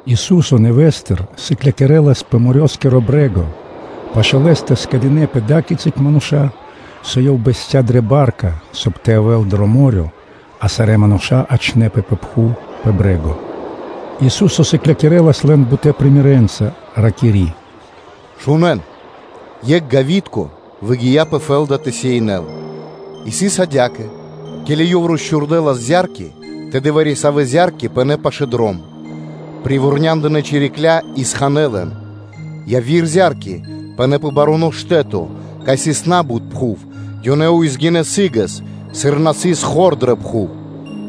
Ису́со нэвэ́стыр (нэвэ́с) сыклякирэлас пэ морёскиро (дэрьявэ́скиро) брэ́го; пашы́л Лэ́стэ скэдынэ́пэ ада́кицы мануша́, со Ёв бэсця́ дрэ ба́рка, соб (кай) тэ явэ́л дро мо́рё (дэрья́в), а, соб (кай) сарэ́ мануша́ тэ ячэ́нпэ пэ пхув пэ брэ́го. Ису́со сыклякирэлас лэн бутэ́ примерэнца (сыкаибнэнца), ракири́: “Шунэ́н! Екх гавитко выгия́ пэ фэ́лда тэ сеинэл и сыс адя́кэ: ке́ли ёв росчхурдэлас зя́рки, тэды вари-савэ́ зя́рки пынэ́ пашы́л дром. Привурняндынэ чирикля́ и ханэ́ лэн. Яви́р зя́рки пынэ́ пэ баруно штэ́то, кай сыс на́бут пхув; ёнэ баринэ упрэ́ сы́гэс, сыр на сыс хор дрэ пхув;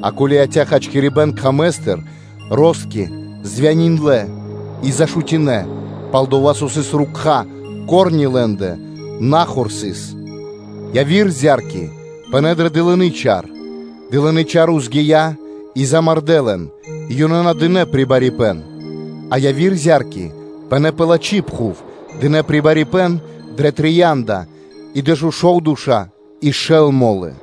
а ко́ли яця́ хачкирибэ́н кхамэстыр, ростки (шчуки) мурдалынэ (звяниндлэ) и зашутинэ, пал-дова́ со ко́рни (рукха́) лэ́ндэ на хор сыс. Яви́р зя́рки пынэ́ дрэ дылыны чар, дылынэ́ чарья́ баринэ упрэ́ и замардэ́ лэн, и ёнэ на дынэ́ прибарипэн. А яви́р зя́рки пынэ́ пэ лачхи́ пхув, дынэ́ прибарипэн дрэ трия́нда и дэшушовдэша и шэл мо́лы!”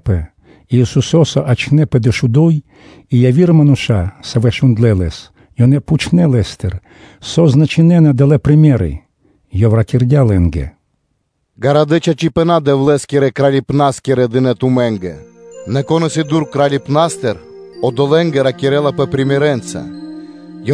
Ке́ли мануша́ розгинэпэ и Исусо́са ячнэ́пэ дэшуду́й и яви́р мануша́, савэ́ шундлэ́ Лэс, ёнэ пхучнэ́ Лэ́стыр, со значынэна далэ́ примеры (сыкаибэна)? И Ёв ракирдя́ лэ́нгэ: “Гарадэ́ чачипэна́ Дэвлэ́скирэ Кралипнаскирэ дынэ́ тумэ́нгэ. Нэ кон исын дура́л Кралипнастыр, одолэ́нгэ ракирэлапэ примерэнца (сыкаибнэнца).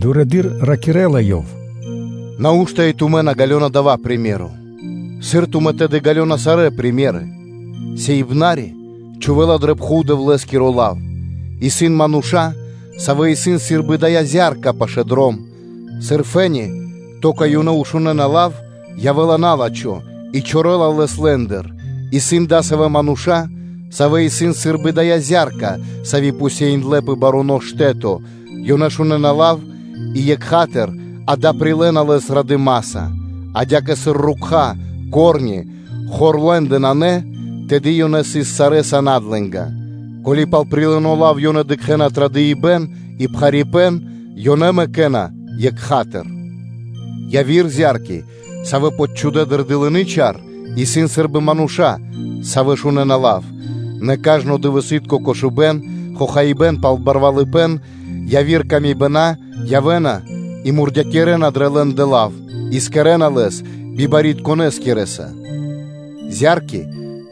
Дурэды́р ракирэ́ла Ёв: “Нау́што и тумэ́ на ґалёна дава́ приме́ро (сыкаибэ́н)? Сыр тумэ́ тэды ґалёна сарэ́ примеры (сыкаибэна)? Сеиныбнаскиро чхувэ́ла дрэ пхув Дэвлэ́скиро лав. Исын мануша́, савэ́ исын сы́рбы дая́ зя́рка пашы́л дром. Сыр фэ́ни (то́ка) ёнэ шунэ́на лав, то явэ́ла на́лачхо и чорэла лэс лэ́ндыр. Исын адасавэ́ мануша́, савэ́ исын сы́рбы дая́ зя́рка, сави́ посеиндлы пэ баруно штэ́то: ёнэ шунэ́на лав и екха́тыр (сра́зу), акэ, прилэ́на лэс радыма́са. А адя́кэ, сыр ко́рни (рукха́) хор лэ́ндэ нанэ, тэды ёнэ сыс сарэ́са надлэнга. Ко́ли пал прилыно лав ёнэ дыкхэ́на традыпэн и пхарипэ́н, ёнэ мэкэ́на лав екха́тыр. Яви́р зя́рки, савэ́ почхудэ дрэ дылыны чар, исын сы́рбы мануша́, савэ́ шунэ́на лав: нэ кажно дывэсы́тко кошыбэ́н, хохаибэ́н пал барвалыпэ́н, яви́р мысли пэ ило́ явэ́на и мурдякирэна дрэ лэ́ндэ лав и кэрэ́на лэс бибарьякирдонэскирэса. Зя́рки,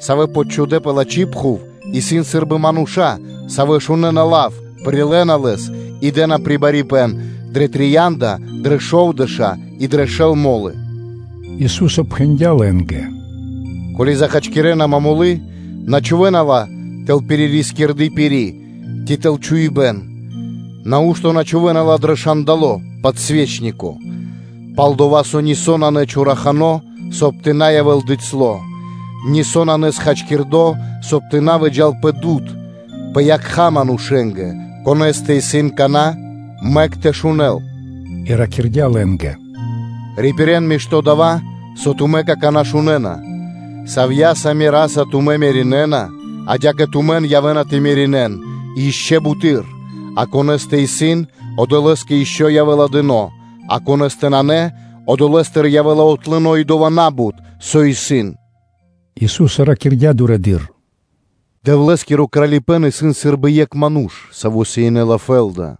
савэ́ почхудэ пэ лачхи́ пхув, исын сы́рбы мануша́, савэ́ шунэ́на лав, прилэ́на лэс и дэ́на прибарипэн дрэ трия́нда и дрэ шовдэша́ и дрэ шэл мо́лы.” Ису́со пхэндя́ лэ́нгэ: “Ко́ли захачкирэна момолы, на чхувэ́на ла тэл пирискирды пири́ ци тэл чхуибэ́н? Нау́што на чхувэ́на ла дро шандало (подсвечнико)? Пал-дова́ со нисо́ нанэ чорахано; соб (кай) тэ на явэ́л бицяло́ (дыцьло), нисо́ нанэ счхакирдо, соб (кай) тэ на выджа́л пэ дуд (свэ́то), пэ якха́ манушэ́нгэ. Конэ́стэ исын кана́, мэк тэ шунэ́л!” И ракирдя́ лэ́нгэ: “Рипирэн мишто́ дава́, со тумэ́ какана́ шунэ́на: савья́са мераса тумэ́ меринэна, адя́кэ тумэн явэ́на тэ меринэн и ишчо (инкэ́) буты́р. А конэ́стэ исын, одолэ́скэ ишчо (инкэ́) явэ́ла дыно́, а конэ́стэ нанэ, одолэ́стыр явэ́ла отлыно и дова́ на́бут, со исын.” Ису́со ракирдя́ дурэды́р: “Дэвлэ́скиро Кралипэ́н исын сы́рбы екх ману́ш, саво́ сеинэла фэ́лда;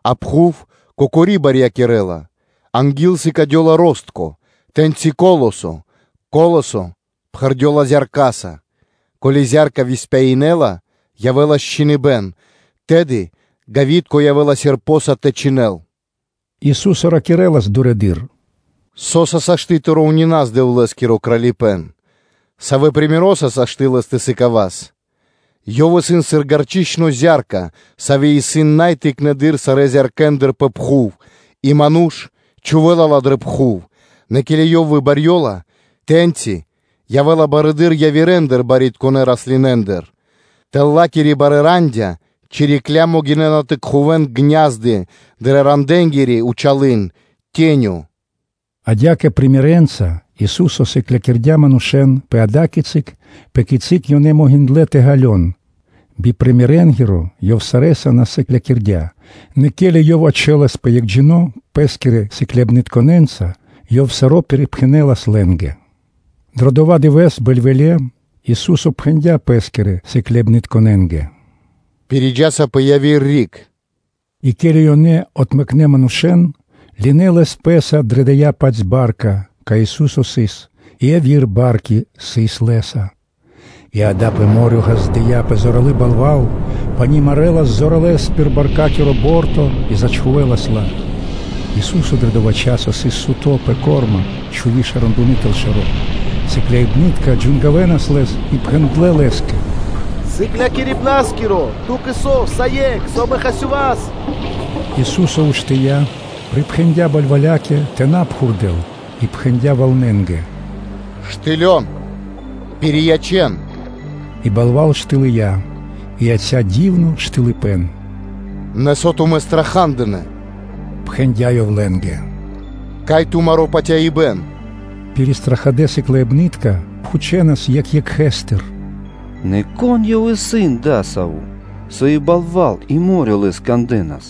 А пхув кокори барьякирэ́ла. Анги́л сыкадёла ростко (шчуко), тэ́ньчи колосо, колосо пхэрдёла зяркаса. Ко́ли зя́рка выспяинэла, явэ́ла счхиныбэн, тэды гавитко явэ́ла серпоса (чхиндлэса) тэ чхинэл.” Ису́со ракирэ́лас дурэды́р: “Со́са сашты́ (можна) тэ роўнинас Дэвлэ́скиро Кралипэ́н? Савэ примероса (сыкаибнаса) сашты́ лэс тэ сыкавас? Ёв исын сыр гарчычно зя́рка, сави́ исын най тыкнэды́р сарэ́ зяркэндыр пэ пхув, и ману́ш чхувэ́ла ла дрэ пхув, Нэ ке́ли ёй выбырьёла, тэ́ньчи явэ́ла барэды́р явирэндыр барьякирдонэ раслинэндыр. Тэл ла́кирэ барэ́ рандя́ чирикля́ могинэ́на тэ кхувэн гня́зды (ку́фы) дрэ ранденгири зэр (тенё).” Адя́кэ примерэнца (сыкаибнэнца) Ису́со сыклякирдя́ манушэ́н пэ ада́кицы, пэ кици ёнэ могиндлэ́ тэ ґалён; би примерэнгиро Ёв сарэ́са на сыклякирдя́, нэ ке́ли Ёв ячэласпэ екхджино́ пэ́скирэ сыкляибнытконэ́нца, Ёв саро́ пирипхэнэлас лэ́нгэ. Дро дова́ дывэ́с, бэльвэле́, Ису́со пхэндя́ Ппэскирэ сыкляибнытконэ́нгэ: “Пириджаса пэ яви́р риг.” И ке́ли ёнэ отмэкнэ манушэ́н, ёнэ лынэ́ Лэс пэ́са дрэ дая́-паць ба́рка, кай Ису́со сыс; и яви́р барки сыс Лэ́са. И, акэ, пэ мо́рё (дэрья́в) ґаздыя́пэ зоралы́ балва́л. Пани марэлас зоралэ́с пир баркакиро борто и зачхувэлас ла. Ису́со дро дова́ часо сыс суто́ пэ корма, чхуви шэрандуны тэл шэро́. Сыкляибны́тка джангавэнас Лэс, и пхэндлэ́ Лэ́скэ: “Сыклякирибна́скиро! Ту́кэ со, усае́кх исын, со амэ хасёваса?” Ису́со уштыя́, припхэндя́ балвалякэ тэ на пхурдэл и пхэндя́ валнэнгэ: “Штыл! Пириячэн!” И балва́л штылыя и яця́ дивно штылыпэн. “Нэ, со тумэ́ страха́дынэ? – пхэндя́ Ёв лэ́нгэ, – кай исын тумаро́ патяибэ́н?” Пиристрахадэ сыкляибны́тка пхучэнас екх екхэстыр: “Нэ кон Ёв исын адасаво́, со и балва́л и мо́рё (дэрья́в) Лэс кандэ́на?”